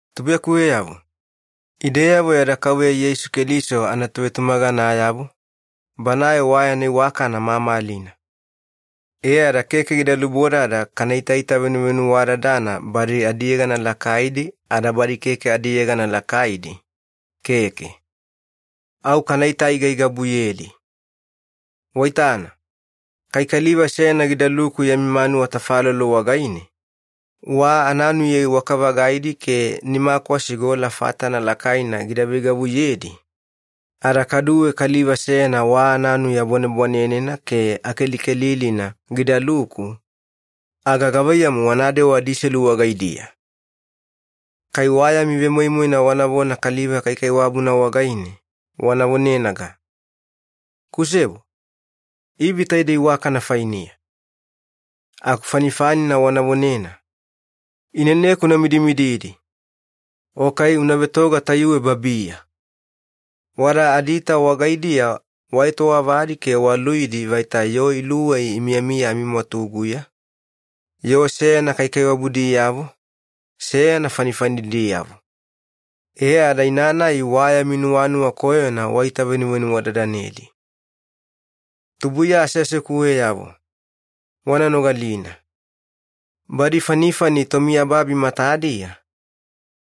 Tubuiyakuweyavo, ideyavo yada Kauveya Yeisu Keliso anatovetumaganayavo, Banae wa yana iwakana mamalina. E ada keke gida lubodada kana itaita venuvenuwadadana badi adiyegana lakaidi ada badi keke adiyegana lakaidi, keke. Au kanaita-aigaigabuyedi. Waitana, kai kaliva seyana gidaluku yami manuwa tafalolo wagaine, wa ananuya iwaka-vagaidi ke nimakwasi gola fatana lakaina gida veigavuyedi, ada kaduwe kaliva seyana wa ananuya bwanebwanenena ke akelikelilina gidaluku, aga gavaiyamu wanadewa adiselu wagaidiya? Kai wa yami vemoimoina wanavona kaliva kaikaiwabuna wagaine, wana vonenaga, “Kusebo, ivi taidei iwakana fainiya.” Aku fanifanina wana vonena, “Ineneku una midimididi,” o kai “Una vetoga tayuwe babiya.” Wada adiita wagaidiya waetowavadi ke waluidi vaita yoo iluwei imiyamiya amimwatuguya, yoo seyana kaikaiwabudiyavo, seyana fanifanidiyavo. E ada ina-nai wa yami nuwanuwa koyona waitavenuvenuwadadanedi. Tubuiya aseasekuweyavo, wana nogalina. Badi fanifani tomiyababi matadiya,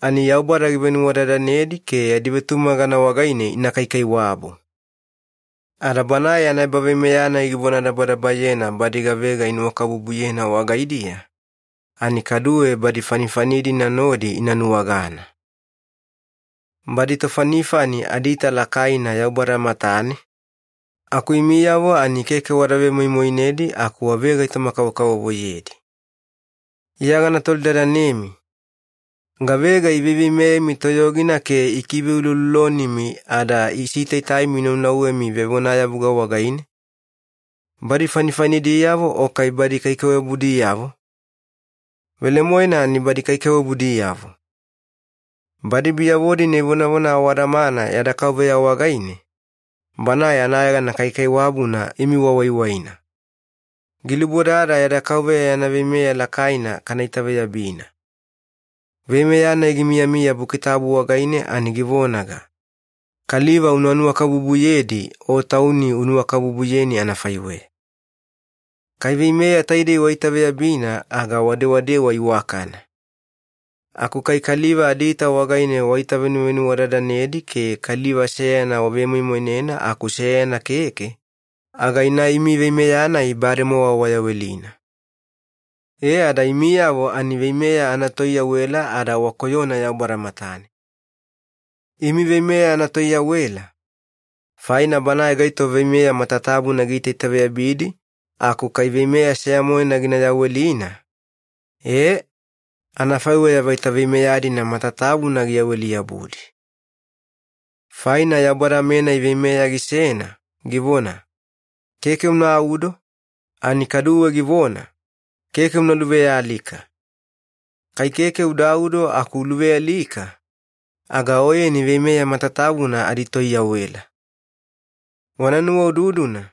ani Yaubada givenuwadadanedi ke yadi vetumagana wagaine ina kaikaiwabu. Ada Banae yana ebaveimeya-nai givonadabadabayena badi gavega inuwakabubuyena wagaidiya, ani kaduwe badi fanifani-dina nodi ina nuwagana. Badi tofanifani adiita lakaina Yaubada matane, aku imiyavo ani keke wada vemoimoinedi aku wavegaitoma-kavokavovoyedi. Iya gana tolidadanemi, gavega iveiveimeyemi toyogina ke ikiveuloulolonimi ada isitaitaimi inaunauwemi vevonayavuga wagaine? Badi fanifanidiyavo o kai badi kaikaiwabudiyavo? Velemoena ani badi kaikaiwabudiyavo. Badi biyavo-dina ivonavona awadamana yada Kauveya wagaine, Banae anayegana kaikaiwabuna imi wawaiwaina. Gilubodada yada Kauveya yana veimeya lakaina kana itaveyabina. Veimeya-nai gimiyamiya Buki Tabu wagaine ani givonaga, Kaliva una nuwakabubuyedi o tauni unuwakabubuyeni anafaiweya. Kai veimeya taidei waitaveyabina aga wadewadewa iwakana. Aku kai kaliva adiita wagaine waitavenuvenuwadadanedi ke kaliva seyana wavemoimoinena aku seyana keke, aga ina imi veimeya-nai bademowa wayawelina. E ada imiyavo ani veimeya anatoiyawela ada wakoyona Yaubada matane. Imi veimeya anatoiyawela, faina banae gaito veimeya matatabuna giitaitaveyabidi aku kai veimeya seya-moena gina yawelina, e, anafaiweya vaita veimeya-dina matatabuna giyaweli-yabudi. Faina Yaubada-menai veimeya gisena givona, “Keke unaudo” ani kaduwe givona, “Keke una luvealika.” Kai keke udaudo aku uluvealika, aga oyeni veimeya matatabuna aditoyawela. Wana nuwaududuna,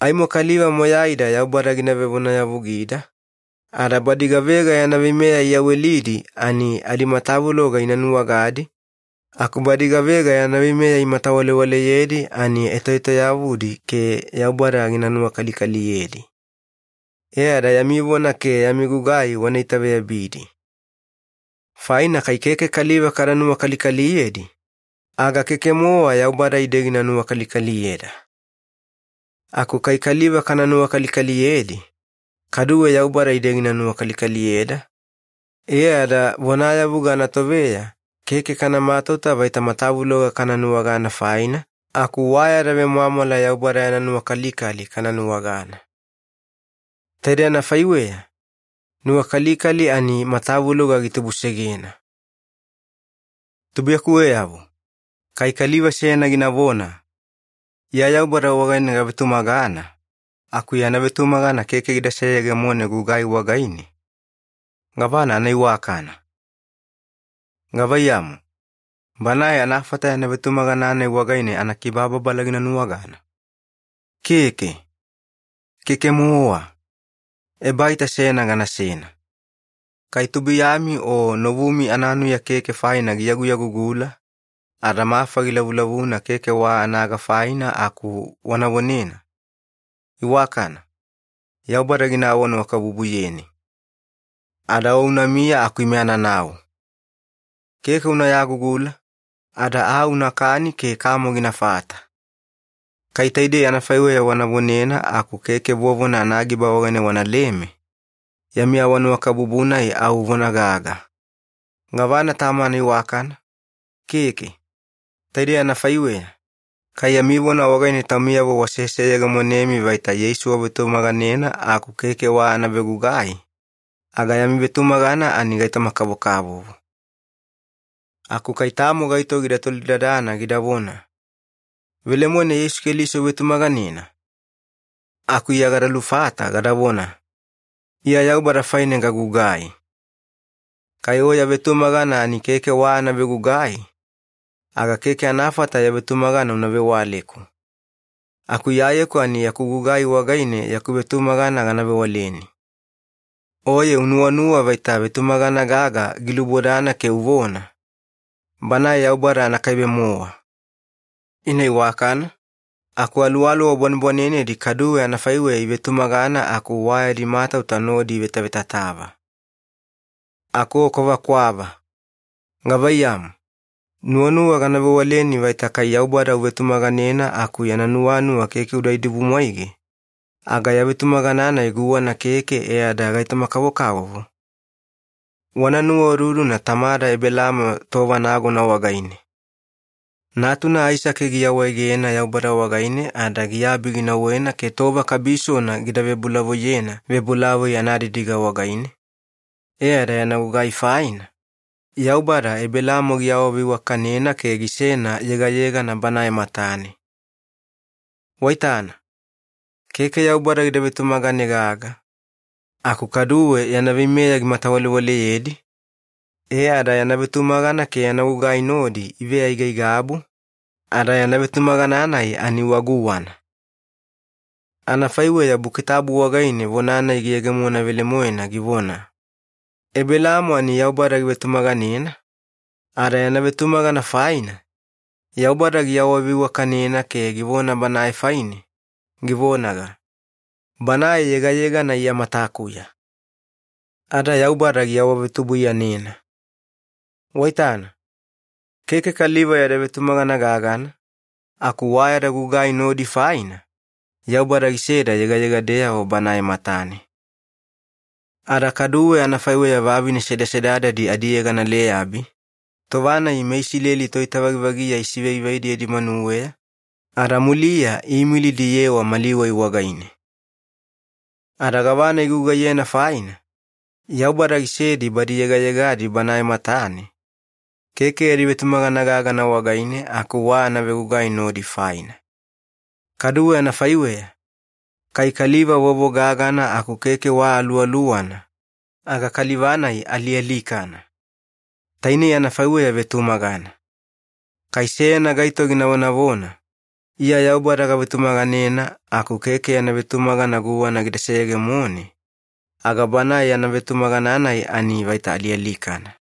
aimo kaliva moyaida Yaubada gina vevonayavugida, ada badi gavega yana veimeya iyawelidi ani adimatavuloga ina nuwagadi, aku badi gavega yana veimeya imatawalewaleyedi ani etoetoyavudi ke Yaubada gina nuwakalikaliyedi. E ada yami vona ke yami gugai wana itaveyabidi. Faina kai keke kaliva kada nuwakalikaliyedi, aga keke-mowa Yaubada ide gina nuwakalikaliyeda. Aku kai kaliva kana nuwakalikaliyedi, kaduwe Yaubada ide gina nuwakalikaliyeda, e ada vonayavuga anatoveya keke kana matauta vaita matavuloga kana nuwagana faina, aku wa yada vemwamwala Yaubada yana nuwakalikali kana nuwagana. Taidei anafaiweya, nuwakalikali ani matavuloga gitubusegena. Tubuiyakuweyavo, kai kaliva seyana ginavona, “Iya Yaubada wagaine gavetumagana” aku yana vetumagana keke gida seyegemone gugai wagaine, gavana anaiwakana? Gavaiyamu, banae anafata yana vetumagana-nai wagaine anakibababala gina nuwagana? Keke, keke-mowa. Ebaita seyana ganasena. Kai tubuiyami o novumi ananuya keke faina giyaguyagugula, ada mafa gilavulavuna keke wa anaga faina aku wana vonena, “Iwakana, Yaubada gina awanuwakabubuyeni. Ada o unamiya aku ime ananau. Keke una yagugula, ada aa unakani ke kamo ginafata.” Kai taidei anafaiweya wana vonena aku keke vovona anagiba wagaine wanaleme, yami awanuwakabubu-nai au vona gaga. Gavana tamo anaiwakana? Keke. Taidei anafaiweya, kai yami vona wagaine taumiyavo waseseyegemonemi vaita Yeisu wavetumaganena aku keke wa anavegugai, aga yami vetumagana ani gaitoma-kavokavovo. Aku kai tamo gaito gida tolidadana gidavona, “Velemoena Yeisu Keliso uvetumaganena?” Aku Iya gada lufata gadavona, “Iya Yaubada faine gagugai. Kai o ya vetumagana ani keke wa anavegugai, aga keke anafata ya vetumagana una vewaleku. Aku Iyayeku ani yaku gugai wagaine yaku vetumagana gana vewaleni.” Oye unuwanuwa vaita vetumagana gaga gilubodana ke uvona, “Banae Yaubada anakaibe-mowa.” Ina iwakana, aku aluwaluwa bwanebwanenedi kaduwe anafaiweya ivetumagana aku wa yadi matauta nodi ivetavetatava. Aku o kwavakwava. Gavaiyamu, nuwanuwa gana vewaleni vaita kai Yaubada uvetumaganena aku yana nuwanuwa keke uda idibumwaige, aga ya vetumagana-nai guwana keke e ada gaitoma-kavokavovo? Wana nuwaududuna tamada Ebelaamo tova nagona wagaine. Natuna Aisake giawaegena Yaubada wagaine ada giabi ginauwena ke tova kabisona gida vebolavoiyena vebolavoi anadidiga wagaine, e ada yana gugai faina, Yaubada Ebelaamo giawaveiwakanena ke gisena yegayegana Banae matane. Waitana, keke Yaubada gida vetumagane gaga, aku kaduwe yana veimeya gimatawalewaleyedi, e ada yana vetumagana ke yana gugai nodi iveaigaigabu, ada yana vetumagana-nai ani wa guwana. Anafaiweya Buki Tabu wagaine vona-nai giyegemona velemoena givona, “Ebelaamo ani Yaubada givetumaganena, ada yana vetumagana faina, Yaubada giawaveiwakanena ke givona banae faine, givonaga, ‘Banae yegayegana Iya matakuya.’” Ada Yaubada giawavetubuiyanena. Waitana, keke kaliva yada vetumagana gagana, aku wa yada gugai nodi faina, Yaubada giseda yegayegadeyavo Banae matane. Ada kaduwe anafaiweya vavine sedasedadadi adiyegana Leyabi, tova-nai meIsileli toitavagivagiya isivaivaidi yadi manuweya ada muliya iimilidi iyewa mali wai wagaine. Ada gavana igugaiyena faina, Yaubada gisedi badi yegayegadi Banae matane, keke yadi vetumagana gagana wagaine aku wa anavegugai nodi faina. Kaduwe anafaiweya, kai kaliva vovo-gagana aku keke wa aluwaluwana, aga kaliva-nai alialikana. Tainei anafaiweya vetumagana. Kai seyana gaito gina vonavona, “Iya Yaubada gavetumaganena” aku keke yana vetumagana guwana gida seyegemone, aga banae yana vetumagana-nai ani vaita alialikana.